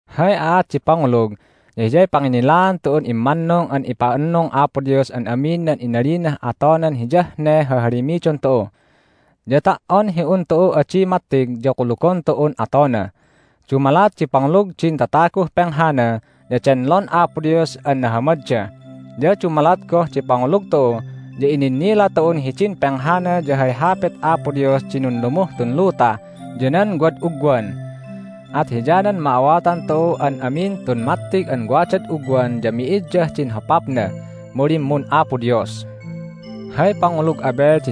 Hay aat di pangulug ya hiyay panginnilaan tu'un immannung an ipa'annung Apo Dios an amin nan inalinah atonan hiyah ne hahalimidon tu'u. Ya ta"on hi un tu'u adi mattig ya kulugon tu'un atona. Dumalat di pangulug din tataguh penghana ya denlon Apo Dios an nahamadda. Ya dumalat goh di pangulug tu'u ya ininnila tu'un hidin penghana ya hay hapit Apo Dios di nunlumuh tun luta ya nan wad ugwan. At hiyanan ma'awatan tu'u an amin tun mattig an wadad ugwan ya mi'iddah din hopapna, mu limmun Apo Dios. Hay Aat di Pangulug Abel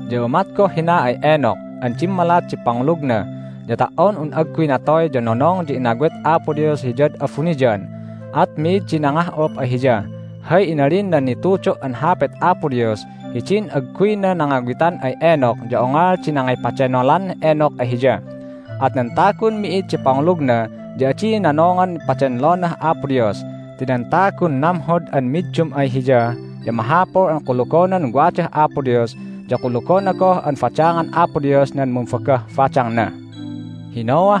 Ya umat goh hina ay Enoch an dimmalat di pangulugna, ya ta"on un agguy natoy ya nonong ya inawit Apo Dios hiyad abuniyan, at mi'id di nangah'up ay hiya. Hay inalin nan nitudo' an Hapit Apo Dios ya hidin agguyna nangawitan ay Enoch ya ongol di nangipadenolan Enoch ay Hiya. At nan tagun mi'id di pangulugna ya adi nonongan padenlonah Apo Dios. Ti nan tagun namhod an middum ay Hiya ya mahapul an kulugonan wadah Apo Dios, ya kulugona goh an badangan Apo Dios nan mumbagah badangna. Hay Aat di Pangulug Noah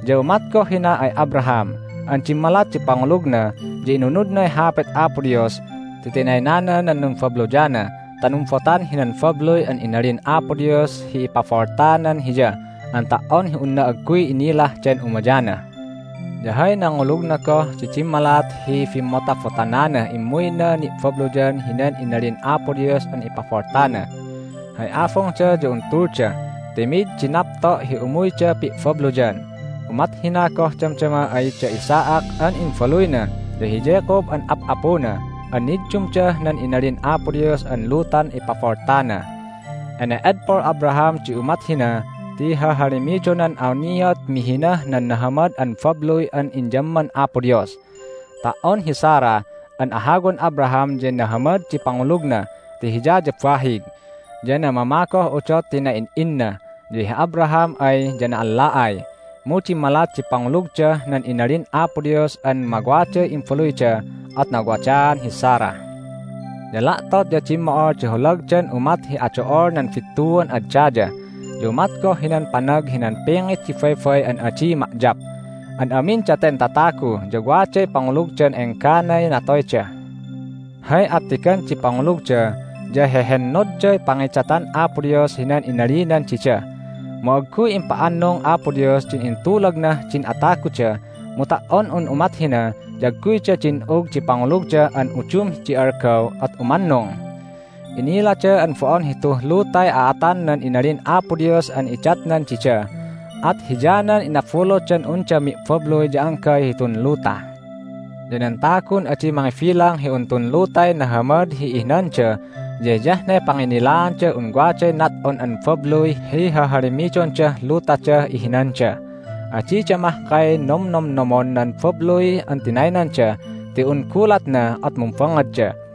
Ya umat goh hina ay Abraham an dimmalat di pangulugna ya inunudnay hapit Apo Dios ti tinaynana nan numbabluyna ta numbotan hinan babluy an inalin Apo Dios hi ipaboltanan hiya an ta"on hi unna agguy inilah den umayana. Ya hay nangulugna goh di dimmalat hi bimmotabotananah immuyna ni'babluyan hinan inalin Apo Dios an ipaboltana. Hay abungda ya un tulda ti mi'id di napto' hi umuyda pi'babluyan. Umat hina goh damdama ay da Isaac an imbaluyna ya hi Jacob an ap'apuna an niddumdah nan inalin Apo Dios an lutan ipaboltana. Ene'edpol Abraham di umat hina ti hahalimidonan awniat mihinah nan nahamad an babluy an inyamman Apo Dios. Ta"on hi Sarah an ahawan Abraham ya nahamad di pangulugna ti hiya ya bahig, ya namama goh udot ti na'in'inna, ya hi Abraham ay ya na'alla'ay, mu dimmalat di pangulugdah nan inalin Apo Dios an mawaday imbaluyda at nawadaan hi Sarah. Ya la'tot ya dimmo'ol di holagdan umat hi ado'ol nan bittuan ad daya, ya umat goh hinan panag hinan pingit di baybay an adi ma'yap. An amin daten tatagu ya waday pangulugdah engganay natoyda. Hay attigan di pangulugda ya hehennodday pangidatan Apo Dios hinan inalinan dida. Mu agguy impa'annung Apo Dios din intulagnah din ataguda, mu ta"on un umat hina ya agguyda din'ug di pangulugda an udum di algaw at umannung. Inilada an bo'on hituh lutay a'atan nan inalin Apo Dios an idatnan dida, at hiyanan inabulutdan unda mi'babluy ya anggay hitun luta. Ya nan tagun adi mangibilang hi un tun lutay nahamad hi ihinanda ya hiyah ne panginnilaandah un waday nat'on an babluy hi hahalimidondah lutadah ihinanda. Adida mahkay nomnomnomon nan babluy an tinaynanda ti un gulatna at numbangngadda.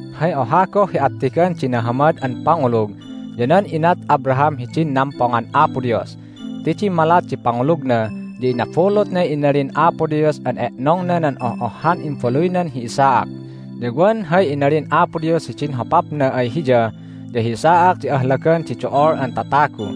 Hay oha goh hi attigan di nahamad an pangulug ya nan inat Abraham hidin nampongan Apo Dios. Ti dimmalat di pangulugna ya inabulutnay inalin Apo Dios an e'nongna nan oh'ohhan imbaluynan hi Isaac, ya wan hay inalin Apo Dios hidin hopapna ay hiya ya hi Isaac di ahlagan di do'ol an tatagu.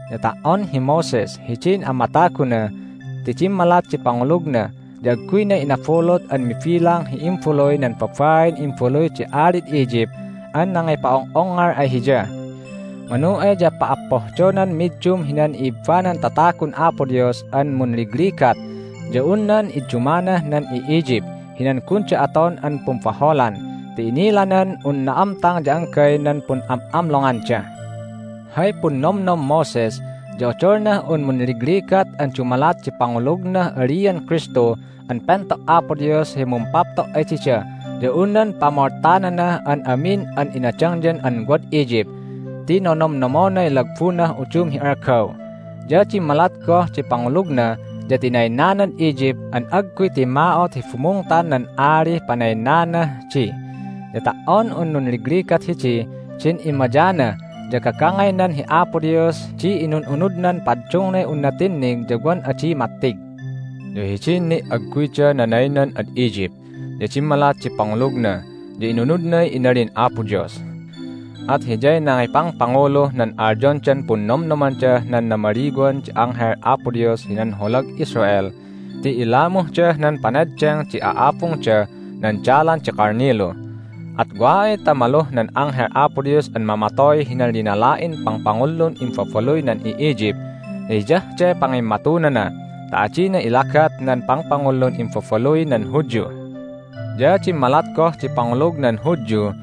Ya ta"on hi Moses hidin amataguna ti dimmalat di pangulugna ya agguyna inabulut an mibilang hi imbaluy nan babain imbaluy di alid Egypt an nangipa'ong'ongngol ay hiya. Manu ay ya pa'appohdonan middum hinan i'ibbanan tatagun Apo Dios an munligligat ya un nan iddumanah nan i'Egypt hinan gunda aton an pumbaholan ti inilanan un na'amtang ya anggay nan pun'am'amlonganda. Hay punnomnom Moses ya odolnah un munligligat an dumalat di pangulugnah alian Kristu an pento' Apo Dios hi mumpapto' ay dida ya un nan pamoltananah an amin an inadangyan an wad Egypt ti nonomnomonay lagbunah udum hi algaw. Ya dimmalat goh di pangulugna ya tinaynanad Egypt an agguy timma'ot hi bumungtan nan alih panaynanah di. Ya ta"on un nunligligat hidih din immayana ya gagangaynan hi Apo Dios di inun'unudnan paddungnay unna tinnig ya wan adi mattig. Ya hidin ni' agguyda nanaynan ad Egypt ya dimmalat di pangulugna ya inunudnay inalin Apo Dios. At hiyay nangipangpanguluh nan alyondan Punnomnomandah nan Namaliwan di Anghel Apo Dios hinan Holag Israel ti ilamuhdah nan paneddeng di a'abungda nan dalan di kalnilu. At wa ay ta maluh nan Anghel Apo Dios an mamatoy hinan linala'in papangpangullun imbabaluy nan i'Egypt ya hiyah de pangimmatunana ta adina ilagat nan pangpangullun imbabaluy nan Hudyu. Hay Aat di Pangulug nan Hudyu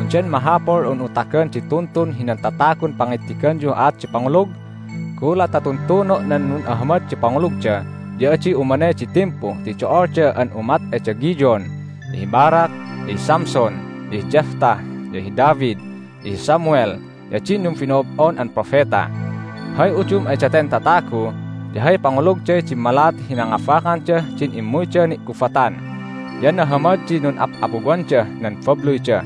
Undan mahapul un'u tagan di tuntun hinan tatagun pangittiganyuh aat di pangulug? Gulat ta tuntuno' nan nun'ahamad di pangulugda ya adi umanay di timpu ti do'olda an umat ay da Gideon, ya hi Barak, ya hi Samson, ya hi Jephthah, ya hi David, ya hi Samuel, ya din numbino'ob'on an propeta. Hay udum ay daten tatagu ya hay pangulugday dimmalat hi nangabakandah din immuyda ni'gubatan, ya nahamad di nun'ap'apuwandah nan babluyda,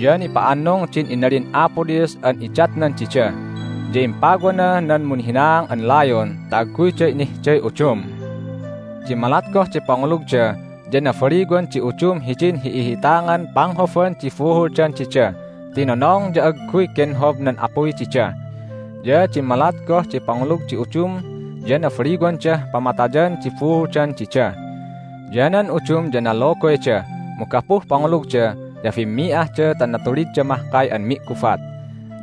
ya nipa'annung din inalin Apo Dios an idatnan dida, ya impawana nan munhinaang an layon ta agguyda inihday udum. Dimmalat goh di pangulugda ya nabaliwan di udum hidin hi'ihi'itangan panghoban di buhuldan dida ti nonong ya agguy genhob nan apuy dida. Ya dimmalat goh di pangulug di udum ya nabaliwandah pamatayan di buhuldan dida. Ya nan udum ya nalogoyda, mu gapuh pangulugda ya bimmi'ahda ta natulidda mahkay an mi'gubat,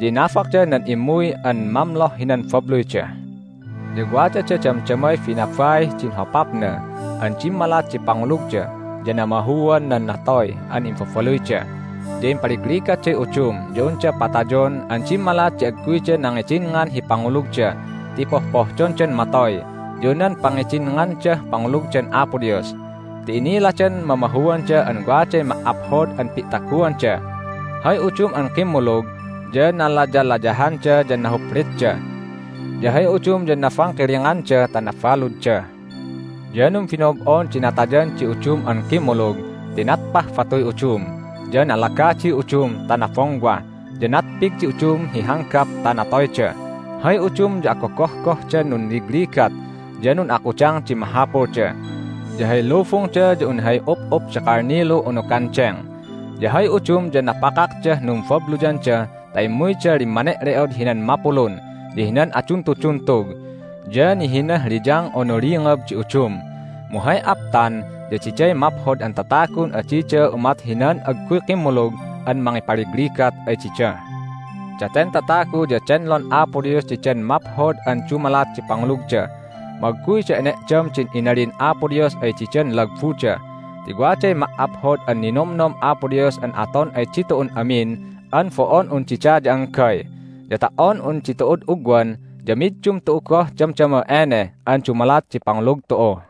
ya inabakda nan immuy an mamloh hinan babluyda. Ya wadada damdamay binabaih din hopapna an dimmalat di pangulugda ya namahuan nan natoy an imbabaluyda. Ya impaligligatday udum ya unda patayon an dimmalat di agguyda nangidinngan hi pangulugda ti pohpohdondan matoy ya nan pangidinngandah pangulugdan Apo Dios. Ti iniladan mamahuanda an waday ma"aphod an pi'taguanda. Hay udum an kimmulug ya nalayalayahanda ya nahuplitda. Ya hay udum ya nabangkilinganda ta nabaludda. Ya numbino'ob'on di natayan di udum an kimmulug ti natpah batuy udum, ya nalagadiy udum ta nabongwah, ya natpig di udum hi hanggap ta natoyda. Hay udum ya agogohgohdan nunligligat ya nun'akudang di mahapulda, ya hay lubungda ya un hay up'up di kalnilu unu gandeng. Ya hay udum ya napakakdah numbabluyanda ta immuyda limmane'le'od hinan mapulun ya hinan aduntuduntug, ya nihinah liyang unu lingab di udum. Mu hay aptan ya diday maphod an tatagun adida umat hinan agguy kimmulug an mangipaligligat ay dida. Daten tatagu ya denlon Apo Dios didan maphod an dumalat di pangulugda, mu agguyda ene'dam din inalin Apo Dios ay didan lagbuda ti waday ma"aphod an ninomnom Apo Dios an aton ay ditu'un amin an bo'on un dida ya anggay. Ya ta"on un ditu'ud ugwan ya middum tu'u goh damdama ene an dumalat di pangulug tu'u.